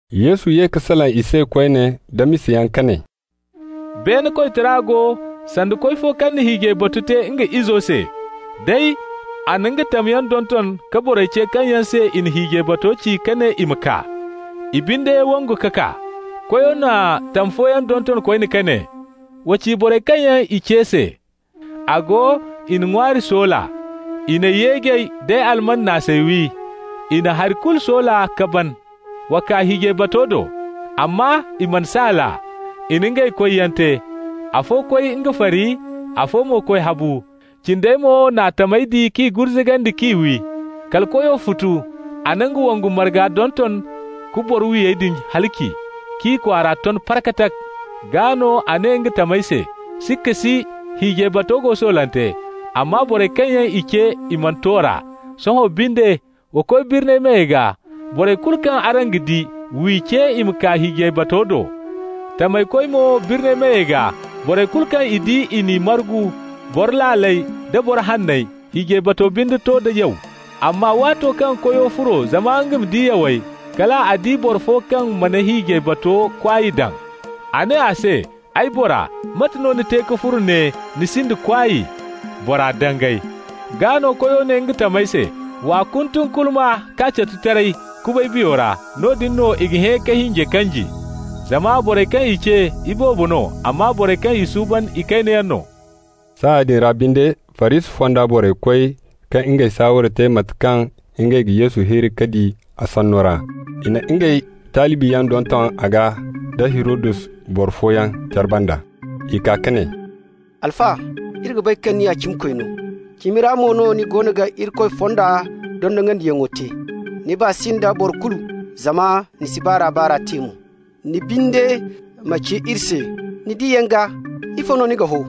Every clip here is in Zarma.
Yesu ye ka salaŋ i se koyne nda misayaŋ ka ne: «Beene koytara go sanda koy fo kaŋ na hiijay batu te nga izo se. Day, a na nga tamyaŋ donton ka borey ce kaŋ yaŋ se i na hiijay bato ci ka ne i ma kaa. I binde wangu ka kaa. Koyo na tam fooyaŋ donton koyne ka ne: ‹Wa ci borey kaŋ yaŋ i ce se: A go, i na ŋwaari soola. I n'ay yeejey d'ay alman naasey wi. I na hari kulu soola ka ban. Wa kaa hiijay bato do.› Amma i mana saal a. I na ngey koyyaŋ te, afo koy nga fari, afo mo koy habu. Cindey mo n'a tamey di k'i gurzugandi k'i wi. Kala koyo futu. A na nga wongu marga donton ka boro-wiyey din halaci, k'i kwaara ton parkatak. Gaa no a ne nga tamey se: ‹Sikka si, hiijay bato go soolante, amma borey kaŋ yaŋ i ce, i mana to r'a. Sohõ binde, wa koy birni meyey gaa. Borey kulu kaŋ araŋ ga di, w'i ce i ma kaa hiijay bato do.› Tamey koy mo birni meyey gaa. Borey kulu kaŋ i di i n'i margu, boro laaley da boro hanney. Hiijay bato binde to da yaw. Amma waato kaŋ koyo furo zama nga ma di yawey, kal a di boro fo kaŋ mana hiijay bato kwaay daŋ. A ne a se: ‹Ay bora, mate no ni te ka furo ne, ni sinda kwaay?› Bora dangay. Gaa no koyo ne nga tamey se: ‹W'a kuntunkulma, k'a catu taray, kubay biyo ra. Noodin no i ga hẽ ka hinjey kanji.› Zama borey kaŋ i ce, iboobo no, amma borey kaŋ i suuban ikaynayaŋ no.» Saaya din ra binde Farisi fonda borey koy ka ngey saaware te mate kaŋ ngey ga Yesu hirri k'a di a sanno ra. I na ngey talibiyaŋ donton a gaa nda Hirodus boro fooyaŋ care banda. I kaa ka ne: «Alfa, iri ga bay kaŋ ni ya cimikoy no, cimi ra mo no ni goono ga Irikoy fonda dondonandiyaŋo te. Ni baa si nda boro kulu zama ni si baar'a-baar'a te mo. Ni binde ma ci iri se, ni diyaŋ gaa ifo no ni ga ho?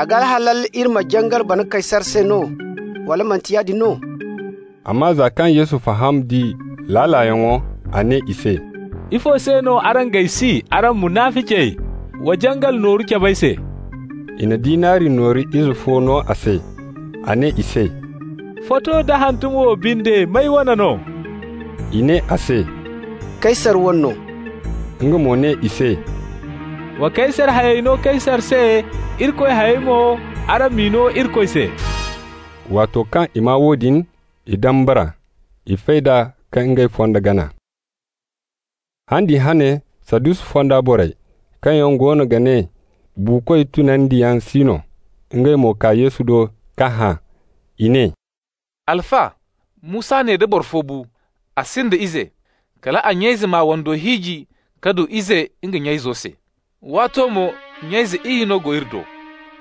A ga halal iri ma jangal bana Kaysar se no, wala manti yaadin no?» Amma za kaŋ Yesu faham d'i laalayaŋo, a ne i se: «Ifo se no araŋ g'ay si, araŋ munaficey? Wa jangal nooru cab'ay se.» I na dinari nooru ize fo no a se. A ne i se: «Foto nda hantumo wo binde, may wane no?» I ne a se: «Kaysar wane no.» Nga mo ne i se: «Wa Kaysar hayey no Kaysar se. Irikoy hayey mo, araŋ m'i no Irikoy se.» Waato kaŋ i maa woodin, i dambara. I fay d'a ka ngey fondo gana. Han din hane Sadusi fonda borey, kaŋ yaŋ goono ga ne buukoy tunandiyaŋ si no, ngey mo kaa Yesu do k'a hã. I ne: «Alfa, Musa ne da boro fo bu, a sinda ize, kal a nya-ize m'a wando hiiji ka du ize nga nya-izo se. Waato mo nya-ize iyye go ne iri do.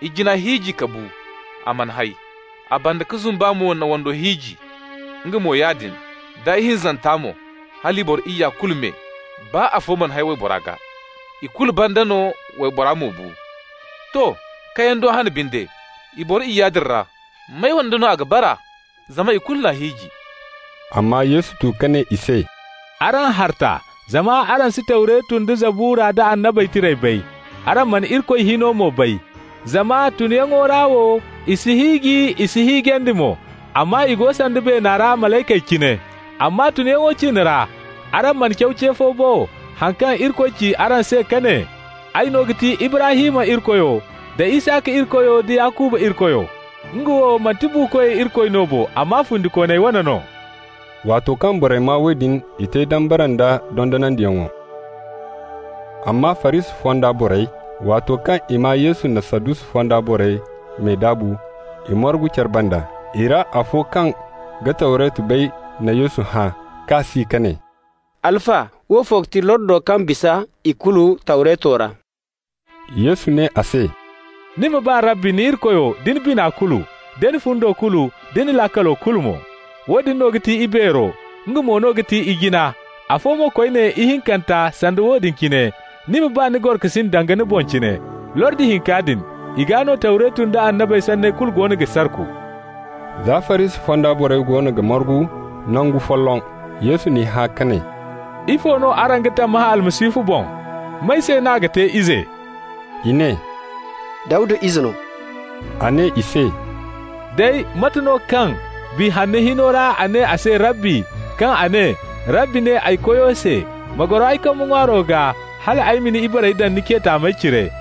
Ijina hiiji ka bu, a mana hay. A banda-ka-zumba mo n'a wando hiiji. Nga mo yaadin, da ihinzanta mo -- hala i boro iyya kulu me, baa afo mana hay waybora gaa. Ikulu banda no waybora mo bu. To. Kayando hane binde, i boro iyya din ra, may wande no a ga bara? Zama ikulu n'a hiiji.» Amma Yesu tu ka ne i se: «Araŋ harta, zama araŋ si Tawretu nda Zabura nda Annabey Tirey bay, araŋ mana Irikoy hino mo bay. Zama tunyaŋo ra wo i si hiiji, i s'i hiijandi mo, amma i go sanda beena ra malaykey cine. Amma tunyaŋo ciine ra, araŋ mana caw ce fo bo, haŋ kaŋ Irikoy ci araŋ se kaŋ a ne: ‹Ay no ga ti Ibrahim Irikoyo, da Isaka Irikoyo, da Yakuba Irikoyo?› Nga wo manti buukoy Irikoy no bo, amma fundikooney wane no.» Waato kaŋ borey maa woodin i te dambara nd'a dondonandiyaŋo. Amma Farisi fonda borey, waato kaŋ i maa Yesu na Sadusi fonda borey me daabu, i margu care banda. I ra afo kaŋ ga Tawretu bay na Yesu hã k'a si ka ne: «Alfa, woofo ga ti lordo kaŋ ga bisa ikulu Tawreto ra?» Yesu ne a se: « ‹Ni ma ba Rabbi ni Irikoyo da ni bina kulu, da ni fundo kulu, da ni laakalo kulu mo.› Woodin no ga ti ibeero, nga mo no ga ti ijina. Afo mo koyne, ihinkanta, sanda woodin cine: ‹Ni ma ba ni gorokasin danga ni boŋ cine.› Lordi hinka din, i gaa no Tawretu nda annabey sanney kulu goono ga sarku.» Za Farisi fonda borey goono ga margu nangu folloŋ, Yesu n'i hã ka ne: «Ifo no araŋ ga tammahã Almasihu boŋ? May se n'a ga te ize?» I ne: «Dawda ize no.» A ne i se: «Day, mate no kaŋ Biya Hanno hino ra a ne a se Rabbi, kaŋ a ne: Rabbi ne ay Koyo se: ‹Ma goro ay kambe ŋwaaro gaa hal ay ma ni ibarey daŋ ni ce taamey cire?›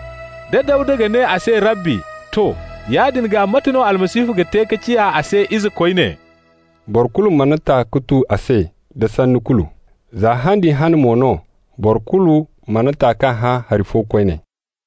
Da Dawda ga ne a se Rabbi, to, yaadin gaa mate no Almasihu ga te ka ciya a se ize koyne?» Boro kulu mana ta ka tu a se da sanni kulu. Za han din hane mo no boro kulu mana ta k'a hã hari fo koyne.